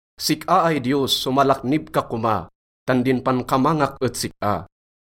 Sik-a ay Diyos, somalaknib ka koma, tan din pankamangak et sik-a.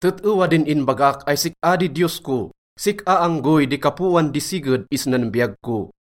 Tet-ewa din inbagak ay sik-a di Diyos ko, sik-a anggoy di kapoan di siged isnan biyag ko.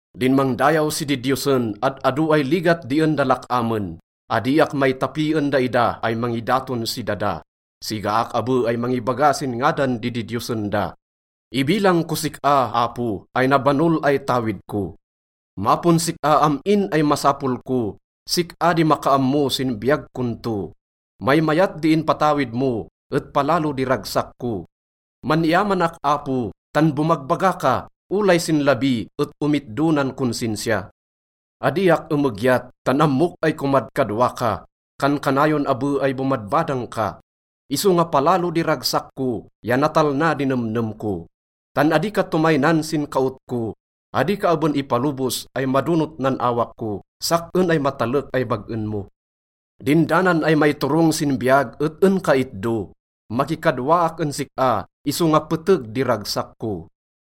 Din mangdayaw si didiyosen, ad-ado ay ligat di en da lak-amen. Adiak maitapi en daida ay mangidaton si dada, sigaak abe ay mangibaga sin ngadan di didiyosen da. Ibilang kos sik-a, Apo, ay nabanol ay tawid ko, mapon sik-a am-in ay masapol ko. Sik-a di makaammo sin biyag kon to. Maymayat di inpatawid mo et palalo di ragsak ko. Man-iyamanak, Apo, tan bomagbaga ka. Olay sin labi et omitdo nan konsinsiya. Adiak emegyat, tan ammok ay komadkadwa ka, kankanayon abe ay bomadbadang ka. Isonga palalo di ragsak ko ya natalna di nemnem ko. Tan adi ka tomaynan sin kaot ko, adi ka aben ipalobos ay madonot nan awak ko, sak-en ay matalek ay bag-en mo. Din danan ay maiturong sin biyag et en ka itdo, makikadwaak en sik-a isonga peteg di ragsak ko.